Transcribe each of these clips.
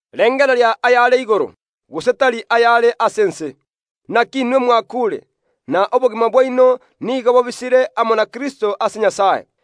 Rengereria ayare igoro, gose tari ayare ase ense. Naki inwe mwakuure, na obogima bwaino nigo bobisire amo na Kristo ase Nyasae.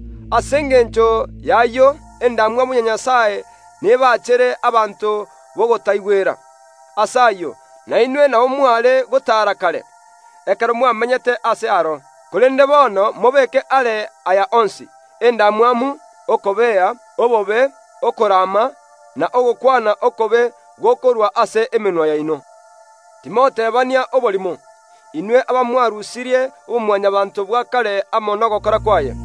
Ase engencho yayio endamwamu ya Nyasae nebachere abanto batarikomoigwera. Ase ayio nainwe nabo mware gotaara kare, ekero mwagamberetwe naro. Korende bono mobeke aare aya onsi: endamwamu, okobea, obobe, okorama, na ogokwana okobe gokorwa ase emenwa yaino. Timotebania oborimo, inwe abamwarusirie oboMwanyabaanto bwa kare amo nogokora kwaye,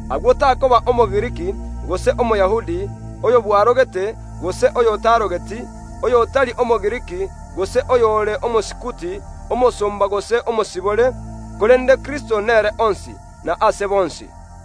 Ase ayio goatananeka tigokoba gati yomogiriki nomoyahudi, oyobwarogete gose oyotarogeti, oyotari Omogiriki gose oyore Omosikuti, omosomba gose omosibore, korende Kristo nere onsi, na ase bonsi.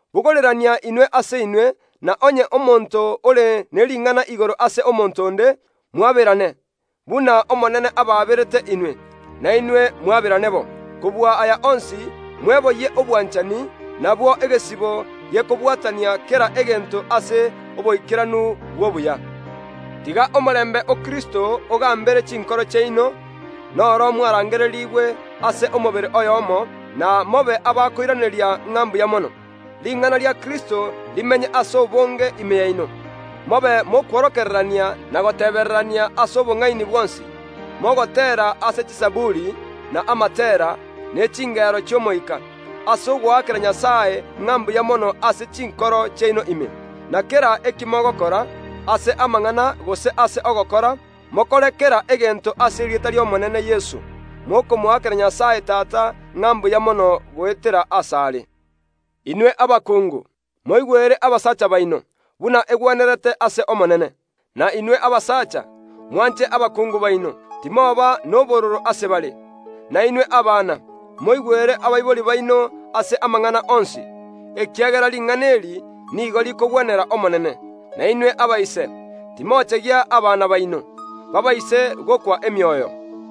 Bogorerania inwe ase inwe, na onye omonto ore ne ring’ana igoro ase omonto onde, mwaberane: buna Omonene abaaberete inwe, nainwe mwaberane bo. Kobua aya onsi, mweboyie obwanchani, nabwo egesibo gekobwatania kera egento ase oboikeranu bw’obuya. Tiga omorembe o Kristo ogambere chinkoro chiaino, noro mwarangererigwe ase omobere oyomo, na mobe abakoiraneria ng’a mbuya mono. Ring’ana ria Kristo rimenye ase obonge ime yaino, mobe mokworokererania na gotebererania ase obong’aini bwonsi, mogoteera ase chizaburi, na amatera, ne chingero chi’omoika, ase ogoakera Nyasae ng’a mbuya mono ase chinkoro chiaino ime. Na kera eki mogokora, ase amang’ana gose ase ogokora, mokore kera egento ase erieta ri’Omonene Yeso, mokomoakera Nyasae Tata ng’a mbuya mono goetera asare. Inwe abakungu, moigwere abasacha baino, buna egwenerete ase Omonene. Na inwe abasacha, mwanche abakungu baino, timoba nobororo ase bare. Na inwe abana, moigwere abaibori baino ase amang’ana onsi, ekiagera ring’ana eri nigo rikogwenera Omonene. Na inwe abaibori, timochegia abana baino, baabaise gokwa emioyo.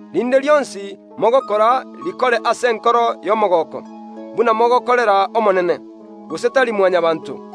Rinde rionsi mogokora rikore ase enkoro y’omogooko, buna mogokorera Omonene, gose tari Mwanyabaanto,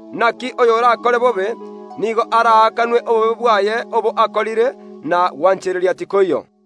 Naki oyorakore bobe, nigo araakanwe obobe bwaye obo akorire, na gwanchereria tikoiyo.